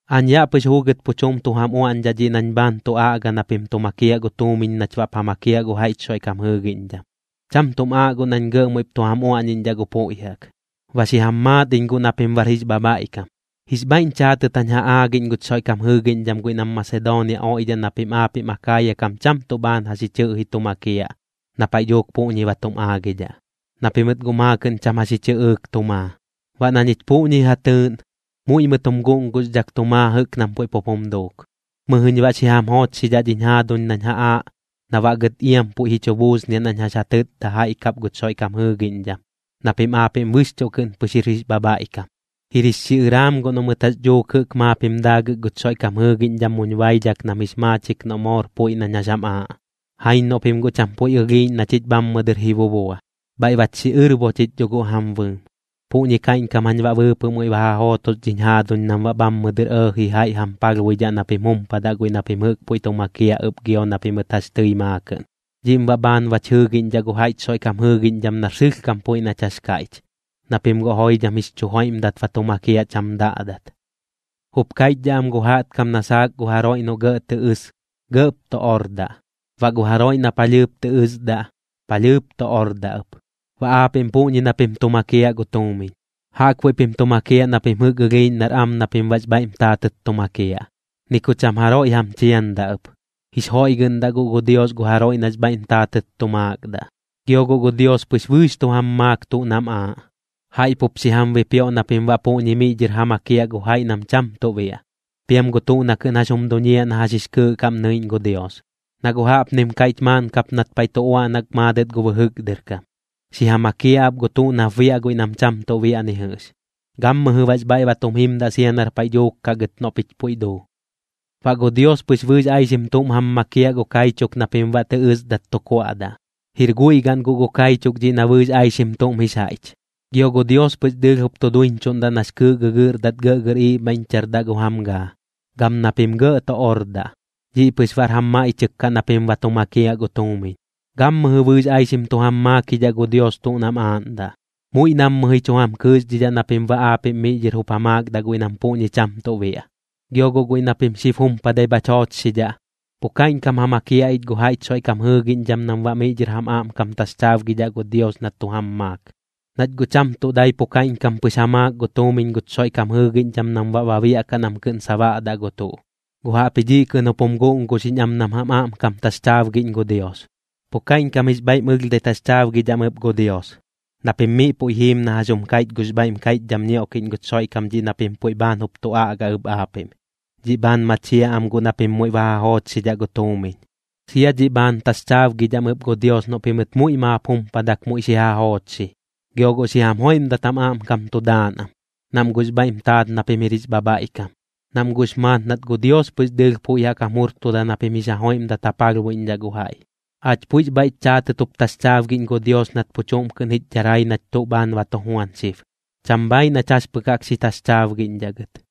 Aañ yaꞌ pɨx juugɨt pu chuꞌm tu jam uaꞌñdhaꞌ dhiꞌ nañ bhaan tu aꞌga na pim tu makiaꞌ gu tuumiñ nach baꞌp ja makiaꞌ gu jaiꞌch Xoiꞌkam jɨɨgiꞌñdham. Cham tuꞌm aaꞌ guꞌ nañ gɇꞌ muiꞌp tu jam uaꞌñiꞌñdhaꞌ gu puiꞌ jaꞌk, ba xi jam maat iñ guꞌ na pim jir jix bhabhaiꞌkam. Jix bhaiꞌñ chaatɨt jañ ja aagiꞌñ guch Xoiꞌkam jɨɨgiꞌñdham guiꞌ nam Masedoonia oiꞌdhaꞌ na pim aapiꞌm Akaaya kam cham tuꞌ bhaan jax ji chɨꞌji tu makiaꞌ na paiꞌ dhuuk puꞌñi ba tum aagidhaꞌ, na pimɨt guꞌ maakɨꞌn cham jax ji chɨꞌɨɨk tu maa. Baꞌ na ñich puꞌñi ja tɨɨꞌn, muiꞌ mɨt jum guꞌnguxdhak tu maa jɨꞌk nam puiꞌ pup jum duuk. Mɨjɨñ baꞌ xi jam joochxidhaꞌ dhiñ jaaduñ nañ ja aaꞌ, na baꞌ gɨt iam puiꞌ ji chu buusniaꞌ nañ jax ja tɨtda jaiꞌ kap guch Xoiꞌkam jɨɨgiꞌñdham na pim aapiꞌm bɨxchuꞌ kɨꞌn pɨx jir jix bhabhaiꞌkam. Jir jix xiꞌɨraam guꞌ noꞌ mɨt jax dhuuk jɨꞌk maap jim daagɨk guch Xoiꞌkam jɨɨgiꞌñdham muñ baidhak nam jix maachik noꞌ moor puiꞌ nañ jax jam aaꞌ. Jaiñ noꞌ pim guꞌ cham puiꞌ ɨlhiiꞌñ na chich bhammɨ dɨr ji bubua, bhaiꞌ bach xiꞌɨrbo chich dho guꞌ jam bɨɨm. Puꞌñi kaiꞌñkam jañ baꞌ bɨɨpɨꞌ muiꞌ ba ja jootos dhiñ jaaduñ nam baꞌ bhammɨ dɨr ɇɇji jaiꞌ jam palhbuidhaꞌ na pim jumpadaꞌ guiꞌ na pim jɨꞌk puiꞌ tu makiaꞌ ɨp gio na pimɨt jax tɨi maakɨꞌn. Dhiꞌm baꞌ bhaan bach jɨɨgiꞌñdhaꞌ gu jaiꞌch Xoiꞌkam jɨɨgiꞌñdham nar sɨlhkam puiꞌ nach jax kaiꞌch, na pim guꞌ joidham jix chu joiꞌmdat ba tu makiaꞌ cham daꞌdat. Jup kaiꞌchdhaꞌ am gu jaꞌtkam na saak gu jaroiꞌ noꞌ gɇꞌ tɨ ɨs, gɇꞌp tu ordaꞌ, baꞌ gu jaroiꞌ na palhɨɨp tɨ ɨsdaꞌ, palhɨɨp tu ordaꞌ ɨp. Baꞌ aapiꞌm puꞌñi na pim tu makiaꞌ gu tuumiñ, jaꞌkbuiꞌ pim tu makiaꞌ na pim jɨꞌk ɨlhiiꞌñ nar am na pim baꞌx bhaiꞌm taatɨt tu makiaꞌ, ni ku cham jaroiꞌ jam chiandaꞌ ɨp. Jix joiꞌgɨꞌndaꞌ guꞌ gu Dios gu jaroiꞌ nax bhaiꞌm taatɨt tu maakdaꞌ. Gio guꞌ gu Dios pɨx bɨɨx tu jam maak tuꞌ nam aaꞌ, jaiꞌ pup xi jam bipioꞌ na pim baꞌ puꞌñi miꞌ dhɨr ja makiaꞌ gu jaiꞌ nam cham tuꞌ biaꞌ, piam gu tuꞌ na kɨꞌn jax jum duñiaꞌ na jax jix kɨɨꞌ kaꞌm nɨiꞌñ gu Dios. Na guꞌ jaꞌpnim kaiꞌch maaꞌn kap nat paiꞌ tu uaꞌnak maadɨt gu bɨjɨk dɨr kam: Xi ja makiaꞌ ap gu tuꞌ nap biaꞌ guiꞌ nam cham tuꞌ biaꞌ ni jɨꞌx, gammɨjɨ baꞌx bhaiꞌ ba tum jimdaꞌ sia nar paiꞌ dhuuk kaꞌ gɨt noꞌ pich puiꞌ duu. Baꞌ gu Dios pɨx bɨɨx aixim tuꞌm jam makiaꞌ gu kaichuk na pim baꞌ tɨ ɨsdat tu kuaꞌdaꞌ, jir guiꞌ gaꞌn guꞌ gu kaichuk dhiꞌ na bɨɨx aixim tuꞌm jix jaiꞌch. Gio gu Dios pɨx dɨɨlh jup tu duiñchuꞌndaꞌ nax kɨɨꞌ gɨgɨꞌrdat gɇꞌgɇr iibhaiꞌñchardaꞌ gu jam gaa, gam na pim gɇꞌ tu ordaꞌ. Dhiꞌ pɨx baꞌr jam maiꞌchɨk kaꞌ na pim ba tu makiaꞌ gu tuumiñ. Gammɨjɨ bɨɨx aixim tu jam maakidhaꞌ gu Dios tuꞌ nam aaꞌndaꞌ, muiꞌ nammɨ ji chu jam kɨɨxdhidhaꞌ na pim baꞌ aapiꞌm miꞌ dhɨr jup ja maakdaꞌ guiꞌ nam puꞌñi cham tuꞌ biaꞌ. Gio guꞌ guiꞌ na pim xib jumpadai bhach joochxidhaꞌ, pu kaiꞌñkam ja makiaꞌ ich gu jaiꞌch Xoiꞌkam jɨɨgiꞌñdham nam baꞌ miꞌ dhɨr jam aꞌmkam taxchaabgidhaꞌ gu Dios na tu jam maak. Nach guꞌ cham tuꞌ dai pu kaiꞌñkam pɨx ja maak gu tuumiñ guch Xoiꞌkam jɨɨgiꞌñdham nam baꞌ ba biaꞌkaꞌ nam kɨꞌn sabaꞌdaꞌ gu tuꞌ, guꞌ jaꞌpji dhiꞌ kɨꞌn jup jum guꞌnguxiꞌñ am nam jam aꞌmkam taxchaabgiꞌñ gu Dios. Pu kaiꞌñkam jix bhaiꞌm ɨlhdhai taxchaabgidhaꞌm ɨp gu Dios, na pim miꞌ puiꞌ jiim na jax jum kaiꞌch gux bhaiꞌm kaiꞌchdham ñioꞌkiꞌñ guch Xoiꞌkam dhiꞌ na pim puiꞌ bhaan jup tu aꞌga ɨp aapiꞌm, dhiꞌ bhaan machiaꞌ am guꞌ na pim muiꞌ ba ja joochxidhaꞌ gu tuumiñ. Sia dhiꞌ bhaan taxchaabgidhaꞌm ɨp gu Dios noꞌ pimɨt muiꞌ maap jumpadak muiꞌ xi ja joochxi. Gio guꞌ xi jam joiꞌmdat jam aꞌmkam tu daan am, nam guꞌx bhaiꞌm taat na pim jir jix bhabhaiꞌkam, nam guꞌx maat nat gu Dios pɨx dɨɨlh puiꞌ jaꞌk jam jurtuda na pim jix ja joiꞌmdat ja palhbuiꞌñdhaꞌ gu jaiꞌ. Aach puiꞌx bhaiꞌch chaatɨt jup taxchaabgiꞌñ gu Dios nat pu chuꞌm kɨꞌn jich dharai nach tuꞌ bhaan ba tu juan xib, cham bhaaiꞌ nach jax pɨk jaꞌk xi taxchaabgiꞌñdhaꞌ gɨt.